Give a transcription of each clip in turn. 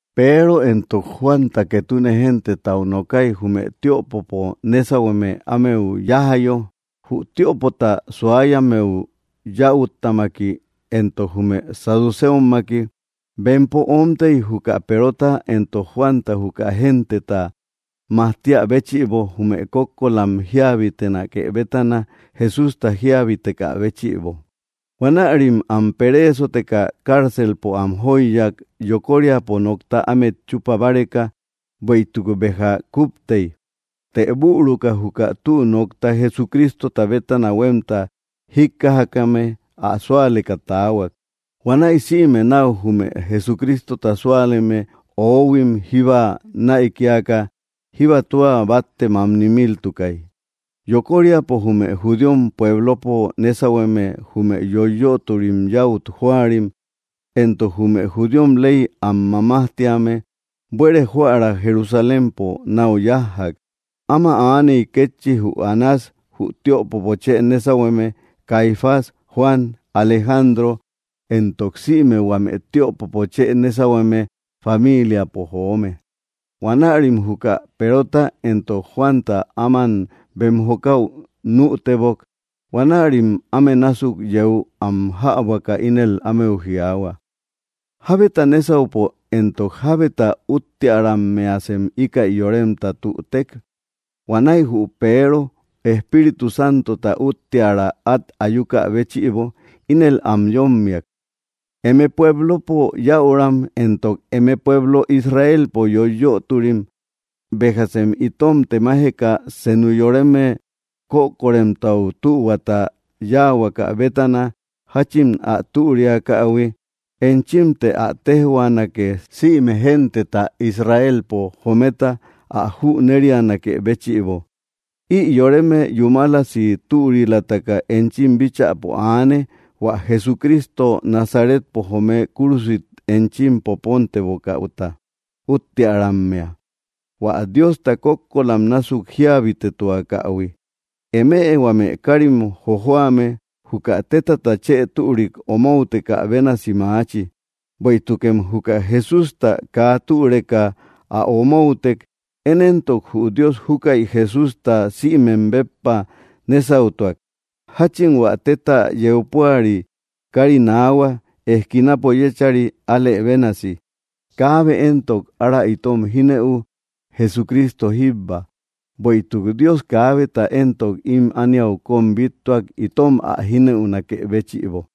Peero éntok Juan ketune gentetau nookai jume tiöpopo nésauhueme ámeu yájayo, jü tiöpota suáyammeu yäuttamaki, éntok jume saduceommaki. Bempo oómtei juka Perota éntok Juanta juka genteta majtíä béchïbo jume kókkolam jíabitenake bétana Jesústa jíabitekä béchïbo. Huanärim am peréesoteka cárcelpo am jóiyak yokóriapo nokta ámet chupa báreka, bueïtuk béja kuptei. Të büruka juka tü nokta Jesucrístota bétana huemta jíkkajakame ä súaleka taahuak. Huanäi sïme nau jume Jesucrístota súaleme, oóhuim jíba näikiaka, jíba tua batte mamni miltukay. Yokóriapo jume judíom puéblopo nésauhueme, jume yoiyötori yäut jóarim, éntok jume judíom ley am mamájtíame, buere joära Jerusalémpo nau yájjak. Ama aaney kétchi jü Anás, jü tiöpopo chë nésauhueme, Caifás, Juan, Alejandro, éntok sïme huame tiöpopo chë nésauhueme famíliapo joome. Huanärim juka Perota éntok Juanta áman bem jokäu nütebok. Huanärim áme násuk yéu am jäbuaka ínel ámeu jiaahua: —¿Jábeta nésaupo, éntok jábeta úttearammeasem íkäi yoremta tütek? Huanäi jü Peero, Espíritu Santota útteara at ayúkä béchïbo, ínel am yómmiak: —Eme puéblopo yäuram, éntok eme pueblo Israelpo yoiyöturim: béjasem itom temajeka senu yoreme kökoremtau tühuata yáahuakä bétana jachin ä türiakähui, enchimte ä téjhuanake sïme genteta Israelpo jometa ä jünérianakë béchïbo. Ï yoreme yúmalasi türilataka enchim bíchäpo aane hua Jesucristo Nazaretpo joome kúrusit enchim popóntebokäuta úttearammea, hua Diosta kókkolam násuk jíabitetuakähui. Eme huame káarim jojoame juka tétata chë türik omoutekä bénasi maachi, bueïtukem juka Jesústa kaa türeka ä omoutek. Én éntok jü Dios júkäi Jesústa sïmem béppa nésautuak, jachin hua tetta yeu púari kari naahua eskinapo yéchari, álë bénasi. Kaabe éntok ára itom jinëu, Jesucristo jíbba; bueïtuk Dios kaábeta éntok im ániau kom bíttuak itom ä jínëunakë béchïbo.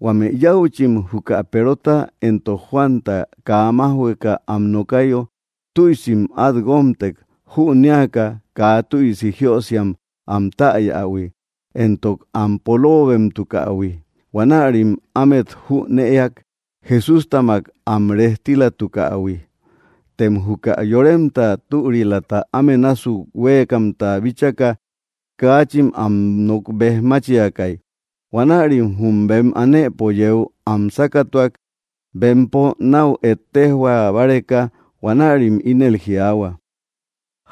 Huame yäuchim juka Perota éntok Juanta kaa májhueka am nokayo tüisim at guómtek, jünéaka kaa tüisi jiösiam am täyähui, éntok am polóobemtukähui. Huanärim ámet jünëak Jesústamak am rejtílatukähui. Tem juka yoremta türilata áme násuk huéekamta bíchaka, kaachin am nok bejmáchiakai. Huanärim jum bem anëpo yéu am sákatuak, bempo nau ettéjhua báreka. Huanärim ínel jiaahua: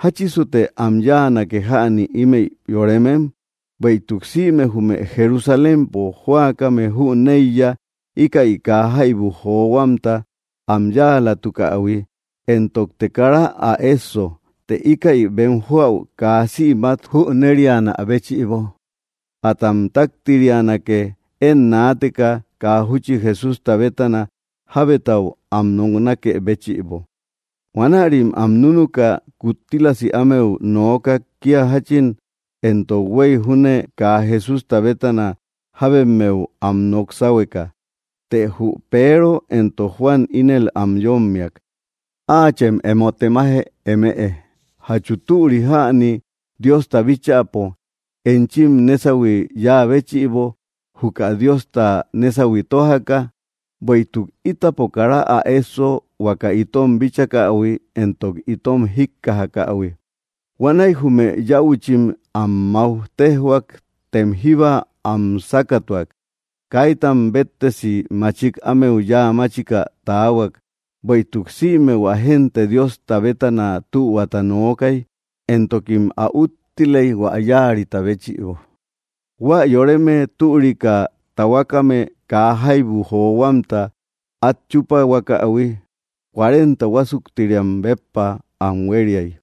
—¿Jáchisute am yáanake jäni ímëi yorémem? Bueïtuk sïme jume Jerusalémpo jóakame jüneiya íkäi kaa jaibu johuamta am yáalatukähui, éntokte kara ä esso. Të íkäi bem joäu kaa sïmat jünérianä béchïbo, atam taktirianake én naateka kaa júchi Jesústa bétana jábetau am noknáke béchïbo. Huanärim am núnuka kuttílasi ámeu noókak kia jachin éntok huei júne kaa Jesústa bétana jábemmeu am nok sáhueka. Të jü Peero éntok Juan ínel am yómmiak: —Áachem emo temaje eme, ¿jachu türi jäni Diosta bíchäpo enchim nesauhui yáa béchïbo, juka Diosta nésauhui tójaka? Bueïtuk ítapo kara ä esso, huaka itom bíchakähui éntok itom jíkkajakähui. Huanäi jume yäuchim am mauj téjhuak, tem jíba am sákatuak. Kaítam béttesi machik ámeu yáa máchika taahuak, bueïtuk sïme hua génte Diosta bétana tühuata nookai, éntokim ä úttilei hua yáarita béchïbo. Huä yoreme türika tahuakame kaa jaibu johuamta at chúpahuakähui cuarenta huásuktiriam béppa am huériay.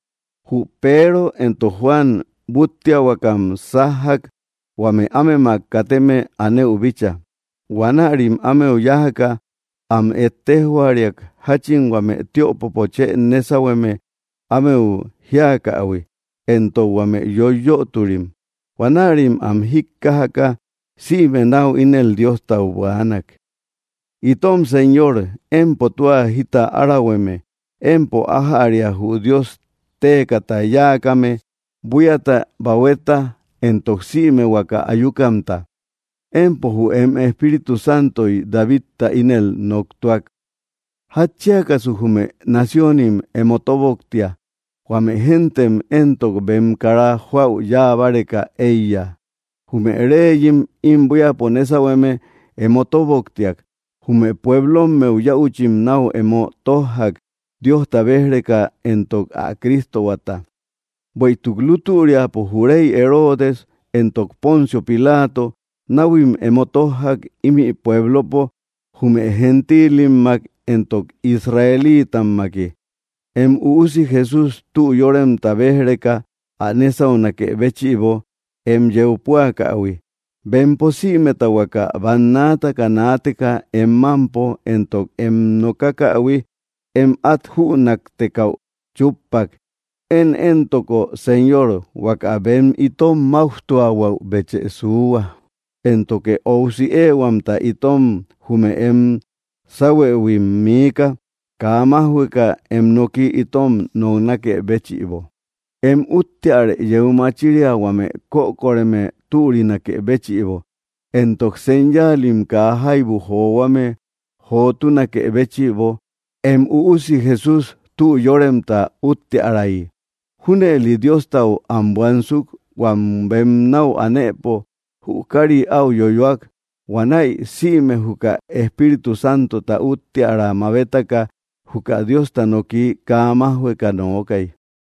Jü Peero éntok Juan búttiahuakam sájjak huame ámemak kateme anëu bícha. Huanärim ámeu yájaka am ettéjhuariak jachin huame tiöpopo chë nésauhueme ámeu jíakähui, éntok huame yoiyöturim. Huanärim am jíkkajaka, sïme nau ínel Diostau buänak: —Itom Señor, empo tua jita árahueme, empo ájäria jü Dios téekata yáakame, buíata, bahueta, éntok sïme huaka ayúkamta. Empo jü em Espíritu Santoy Davidta ínel noktúak: ¿Jatchíakasu jume naciónim emo tóboktia, huame géntem éntok, bem kara joäu yáa báreka eiya? Jume réeyim im buíapo nésauhueme emo tóboktiak, jume puéblommeu yäuchim nau emo tójjak, Diosta béj‑reka éntok ä Cristohuata. ’Bueïtuk lútüriapo jü rey Herodes éntok Poncio Pilato náuhuim emo tójjak imi puéblopo jume gentiilimmak éntok israeliitammaki, em Üusi Jesús tü yóremta béj‑reka, ä nésaunakë béchïbo em yeu púakähui. Bempo sïmeta huaka bannaataka naateka em mampo entok em nokakähui em at jünaktekäu chúppak. Én éntoko, Señor, huaka bem itom máujtuahuäubechë suuhua, éntoke óusi éehuamta itom jume em sáuhuëhuim miika, kaa májhueka em noki itom noknákë béchïbo. Em úttearë yeu machíria huame kökoreme türinakë béchïbo, éntok señáalim kaa jaibu johuame jotúnakë béchïbo em Üusi Jesús tü yóremta úttiärayi. Júnëli Diostau am buansuk, huam bem nau anëpo jü kari au yoyóak. Huanäi sïme juka Espíritu Santota úttiära mabétaka juka Diosta noki kaa májhueka nookai.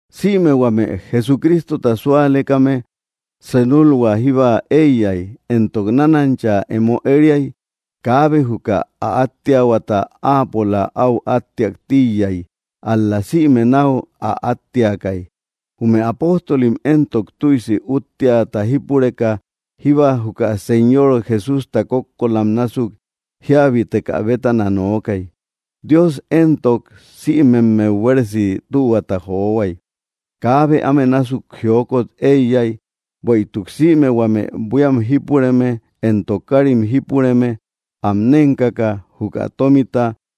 Sïme huame Jesucrístota súalekame senulhua jíba eiyai, éntok nánancha emo ériai. Kaabe juka ä átteahuata áapola au átteak tíiyai, ál‑la sïme nau ä átteakai. Jume apóstolim éntok, tüisi útteäta jípureka jíba juka Señor Jesústa kókkolam násuk jíabitekä bétana nookai. Dios éntok, sïmemmeu buéresi tühuata johuai. Kaabe áme násuk jiókot eiyai, bueïtuk sïme huame buíam jípureme, éntok kárim jípureme, am nénkaka juka tómita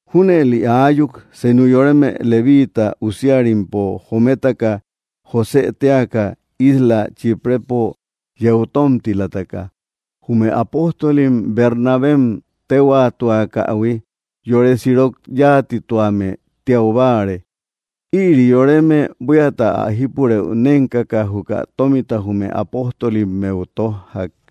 Júnëli aayuk, senu yoreme levíiita usíarimpo jométaka, Josë téaka, isla Chíprëpo yeu tómtilataka, jume apóstolim Bernabem téhuaatuakähui. Yore sirok yáatituame tiau báare. Ïri yoreme buíata ä jípurëu nénkaka juka tómita jume apóstolimmeu tójjak.